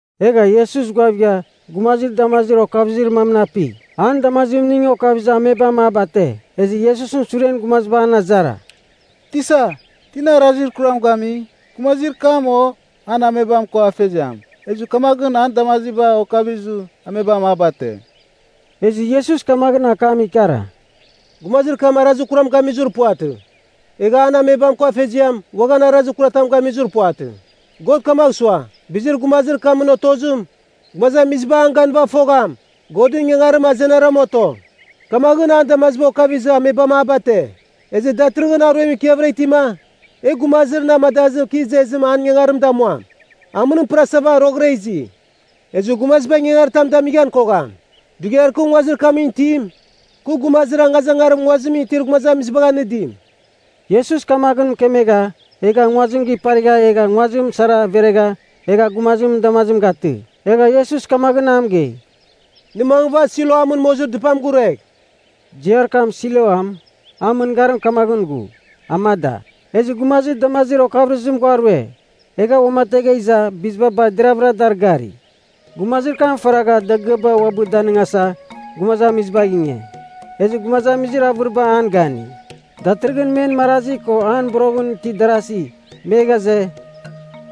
Egha Iesus ghuavigha gumazir damazir okavɨzir mamɨn api. An damazimning okavizɨ amebam a bate. Ezɨ Iesusɨn suren gumaziba an azara. “Tisa, tina arazir kuram gami, gumazir kam o an amebam ko afeziam, ezɨ kamaghɨn an damaziba okavizɨ amebam a bate?” Ezɨ Iesus kamaghɨn akam ikara, “Gumazir kam arazir kuram gamizir puvatɨ, egha an amebam ko afeziam uaghan arazir kuratam gamizir puvatɨ. God kamagh sua, bizir gumazir kamɨn otozim, gumazamiziba an ganɨva fogham, Godɨn ingangarim azenara men oto. Kamaghɨn an damaziba okavizɨ amebam a bate. Ezɨ datɨrɨghɨn aruem ikiavɨra itima, e gumazir na amadazɨ kɨ izezim an ingangarim damuam. Amɨnim pɨrasava roghɨra izi, ezɨ gumaziba ingangaritam damighan kogham. Dughiar kɨ nguazir kamɨn itim, kɨ gumazir angazangarim nguazimɨn itir gumazamizibagh anɨdim.” Iesus kamaghɨn mɨkemegha egha nguazim giparigha egha nguazim sara veregha, egha gumazimɨn damazim gatɨ. Egha Iesus kamaghɨn a mɨgei, “Nɨ mangɨva Siloamɨn mozir dɨpam guruegh.” (Ziar kam Siloam, an mɨngarim kamaghɨn ghu, “Amada.”) Ezɨ gumazir damazir okavɨrɨzim ghua rue. Egha uamategha iza, biziba bar deravɨra dar gari. Gumazir kam faragha dagɨaba uabɨ danɨngasa gumazamizibagh inge, ezɨ gumazamizir avɨriba an gani. Datɨrɨghɨn men marazi ko an boroghɨn itir darazi, me ghaze,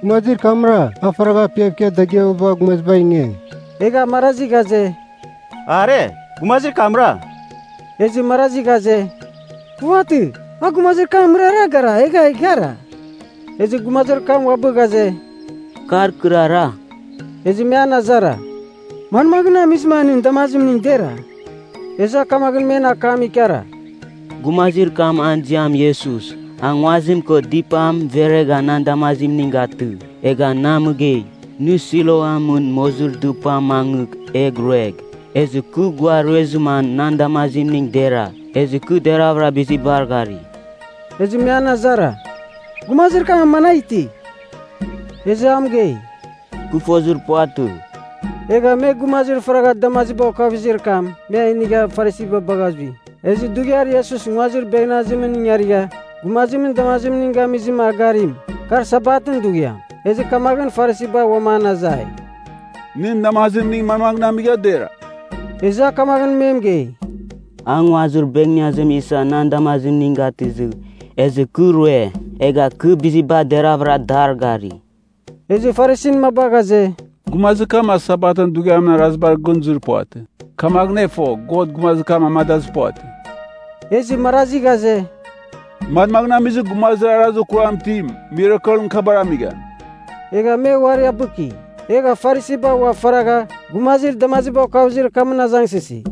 “Gumazir kamra, a faragha apiav ikia dagɨaba bagha gumazibagh inge?” Egha marazi ghaze, “Are, gumazir kamra.” Ezɨ marazi ghaze, “Puvatɨ. A gumazir kamɨn mɨrara gara, egha a ighara.” Ezɨ gumazir kam uabɨ ghaze, “Kar kɨrara.” Ezɨ me an azara, “Manmaghɨn amizɨma nɨn damazimning dera?” Ezɨ a kamaghɨn men akam ikara, “Gumazir kam an ziam Iesus, a nguazim ko dɨpam veregha nan damazimning gatɨ. Egha na mɨgei, ‘Nɨ Siloamɨn mozir dɨpamɨn mangɨgh egh ruegh.’ Ezɨ kɨ ghua ruezɨma nan damazimning dera, ezɨ kɨ deravɨra bizibar gari.” Ezɨ me an azara, “Gumazir kam managh iti?” Ezɨ a mɨgei, “Kɨ fozir puvatɨ.” Egha me gumazir faragha damaziba okavɨzir kam me a inigha Farisiba bagha zui. Ezɨ dughiar Iesus nguazir beghneazimɨn ingarigha gumazimɨn damazimning gamizɨ a garim, kar Sabatɨn dughiam. Ezɨ kamaghɨn Farisiba uam an azai, “Nɨn damazimning manmaghɨn amigha dera?” Ezɨ a kamaghɨn me mɨgei, “A nguazir beghneazim isa nan damazimning gatɨzɨ, ezɨ kɨ rue, egha kɨ biziba deravɨra dar gari.” Ezɨ Farisin maba ghaze, “Gumazir kam a Sabatɨn dughiamɨn arazibar gɨn zuir puvatɨ. Kamaghɨn e fo, God gumazir kam amadazɨ puvatɨ.” Ezɨ marazi ghaze, “Manmagh amizɨ gumazir arazir kuram itim mirakelɨn kabar amigham.” Egha me uari abɨki. Egha Farisiba ua faragha gumazir damaziba okavɨzir kamɨn azangsɨsi,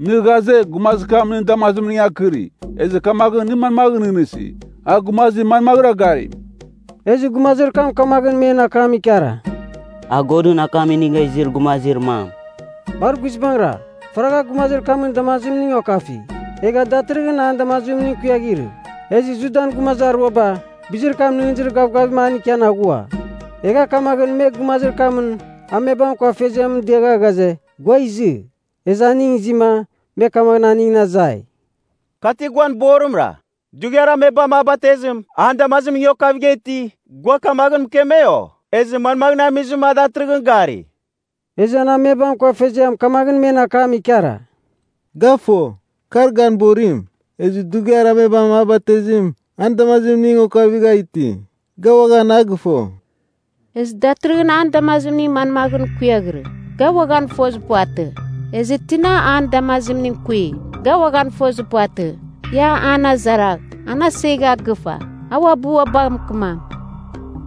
“Nɨ ghaze, gumazir kam nɨn damazimning akɨri, ezɨ kamaghɨn nɨ manmaghɨn nɨghnɨsi, a gumazir manmaghɨra garim?” Ezɨ gumazir kam kamaghɨn me akam ikara, “A Godɨn akam inigha izir gumazir mam.” Bar guizbangɨra, faragha gumazir kamɨn damazimning okafi, egha datɨrɨghɨn an damazimning kuiaghirɨ. Ezɨ Judan gumazir aruaba bizir kam nɨghnɨzir gavgavim an ikian aghua. Egha kamaghɨn me gumazir kamɨn amebam ko afeziamɨn diagha ghaze, gua izɨ. Ezɨ aning izima me kamaghɨn aningɨn azai, “Ka ti guan borimra? Dughiar amebam a batezim, an damazimning okavigha iti, gua kamaghɨn mɨkeme, o? Ezɨ manmagh amizɨma a datɨrɨghɨn gari?” Ezɨ an amebam ko afeziam kamaghɨn men akam ikara, “Ga fo, kar gan borim. Ezɨ dughiar amebam a batezim, an damazimning okavigha iti, ga uaghan a gɨfo. Ezɨ datɨrɨghɨn an damazimning manmaghɨn kuiaghirɨ, ga uaghan fozir puvatɨ. Ezɨ tina an damazimning kui, ga uaghan fozir puvatɨ. Ia an azaragh. An asegha gɨfa. A uabɨ ua bagh mɨkɨmam.”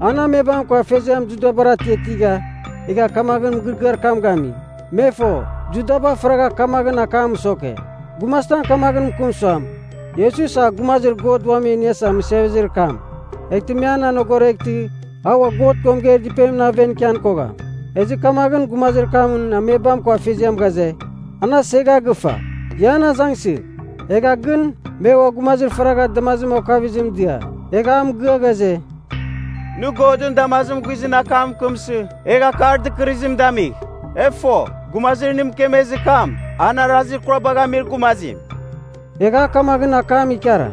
An amebam ko afeziam Judabar atiatigha, egha kamaghɨn mɨgɨrɨgɨar kam gami. Me fo, Judaba faragha kamaghɨn akam mɨsoke, gumazitam kamaghɨn mɨkɨm suam, “Iesus a Gumazir God Uam E Iniasa Mɨsevezir kam,” eghtɨ me an anogoreghtɨ a ua God ko mɨgeir dɨpenimɨn aven ikian kogham. Ezɨ kamaghɨn gumazir kamɨn amebam ko afeziam ghaze, “An asegha gɨfa. Ia an azangsɨgh.” Egha gɨn me ua gumazir faragha damaziba okavɨzim dia, egha a mɨgɨa ghaze, “Nɨ Godɨn damazimɨn guizɨn akam mɨkɨmsɨ egh akar dɨkɨrɨzim damigh. E fo, gumazir nɨ mɨkemezir kam, an arazir kurabagh amir gumazim.” Egha a kamaghɨn akam ikara,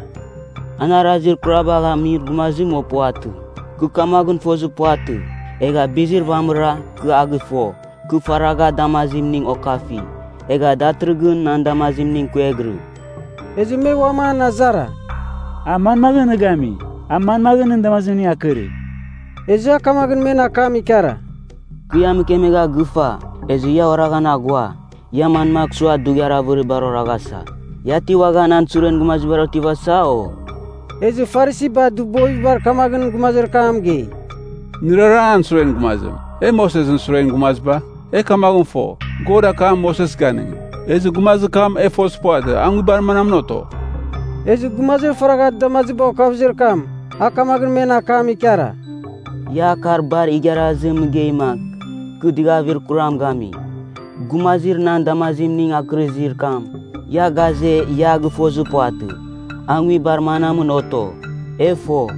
“An arazir kurabagh amir gumazim o puvatɨ, kɨ kamaghɨn fozir puvatɨ. Egha bizir vamɨra, kɨ a gɨfo, kɨ faragha damazimning okafi, egha datɨrɨghɨn nan damazimning kuiaghirɨ.” Ezɨ me uam an azara, “A manmaghɨn nɨ gami? A manmaghɨn nɨn damazimning akɨri?” Ezɨ a kamaghɨn men akam ikara, “Kɨ ia mɨkemegha gɨfa, ezɨ ia oraghan aghua. Ia manmagh sua dughiar avɨribar oraghasa? Ia ti uaghan an suren gumazibar otivasa, o?” Ezɨ Farisiba dɨbovibar kamaghɨn gumazir kam mɨgei, “Nɨrara an suren gumazim. E Mosesɨn suren gumaziba. E kamaghɨn fo, God akam Moses ganɨngi. Ezɨ gumazir kam, e fozir puvatɨ, a nguibar manamɨn oto.” Ezɨ gumazir faragha damaziba okavɨzir kam, a kamaghɨn men akam ikara, “Ia akar bar igharazim mɨgeima, kɨ dɨgavir kuram gami! Gumazir nan damazimning akɨrizir kam, ia ghaze ia gɨfozir puvatɨ, a nguibar manamɨn oto. E fo,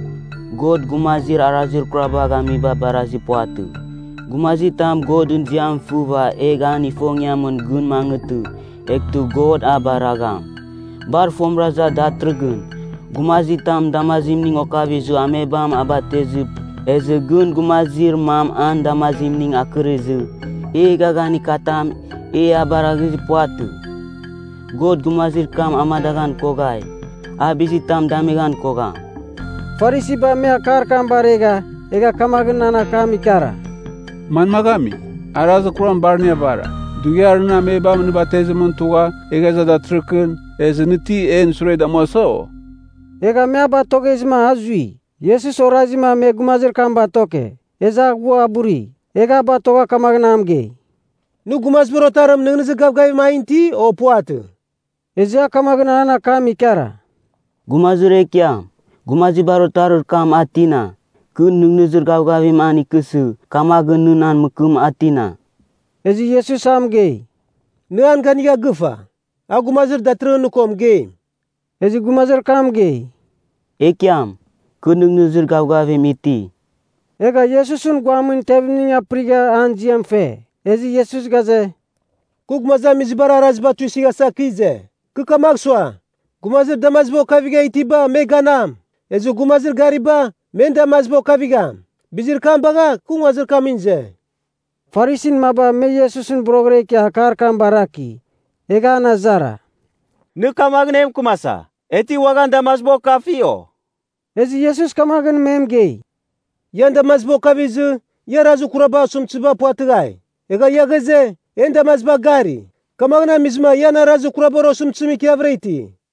God gumazir arazir kurabagh amiba barazir puvatɨ. Gumazitam Godɨn ziam fɨva egh an ifongiamɨn gɨn mangɨtɨ, eghtɨ God a baragham. Bar fomɨra iza datɨrɨkɨn, gumazitamɨn damazimning okavizɨ amebam a batezɨ, ezɨ gɨn gumazir mam an damazimning akɨrizɨ, e eghaghanir katam e a baraghizir puvatɨ. God gumazir kam amadaghan koghai, a bizitam damighan kogham.” Farisiba me akar kam baregha egha kamaghɨn an akam ikara, “Manmagh ami? Arazir kuram bar nɨ avara, dughiar nɨn amebam nɨ batezimɨn tugha egha iza datɨrɨkɨn. Ezɨ nɨ ti en sure damuasa, o?” Egha me a batoghezɨma a zui. Iesus orazima me gumazir kam batoke, ezɨ a ghua a buri. Egha a batogha kamaghɨn a mɨgei, “Nɨ Gumazibar Otarim nɨghnɨzir gavgavim an ti, o puvatɨ?” Ezɨ a kamaghɨn an akam ikara, “Gumazir Ekiam, Gumazibar Otarir kam a tina? Kɨ nɨghnɨzir gavgavim an ikɨsɨ, kamaghɨn nɨ na mɨkɨm, a tina.” Ezɨ Iesus a mɨgei, “Nɨ an ganigha gɨfa. A gumazir datɨrɨghɨn nɨ ko mɨgeim.” Ezɨ gumazir kam mɨgei, “Ekiam, kɨ nɨghnɨzir gavgavim iti.” Egha Iesusɨn guamɨn tevimning apɨrigha an ziam fe. Ezɨ Iesus ghaze, “Kɨ gumazamizibar araziba tuisɨghasa kɨ ize. Kɨ kamagh sua, gumazir damaziba okavigha itiba me ganam, ezɨ gumazir gariba, men damaziba okavigham. Bizir kam bagha, kɨ nguazir kamɨn ize.” Farisin maba me Iesusɨn boroghɨra ikia akar kam baraki. Egha an azara, “Nɨ kamaghɨn e mɨkɨmasa, e ti uaghan damaziba okafi, o?” Ezɨ Iesus kamaghɨn me mɨgei, “Ian damaziba okavizɨ, ia arazir kurabar osɨmtɨziba puvatɨghai. Egha ia ghaze, ‘En damaziba gari.’ Kamaghɨn amizɨma ian arazir kurabar osɨmtɨzim ikiavɨra iti.”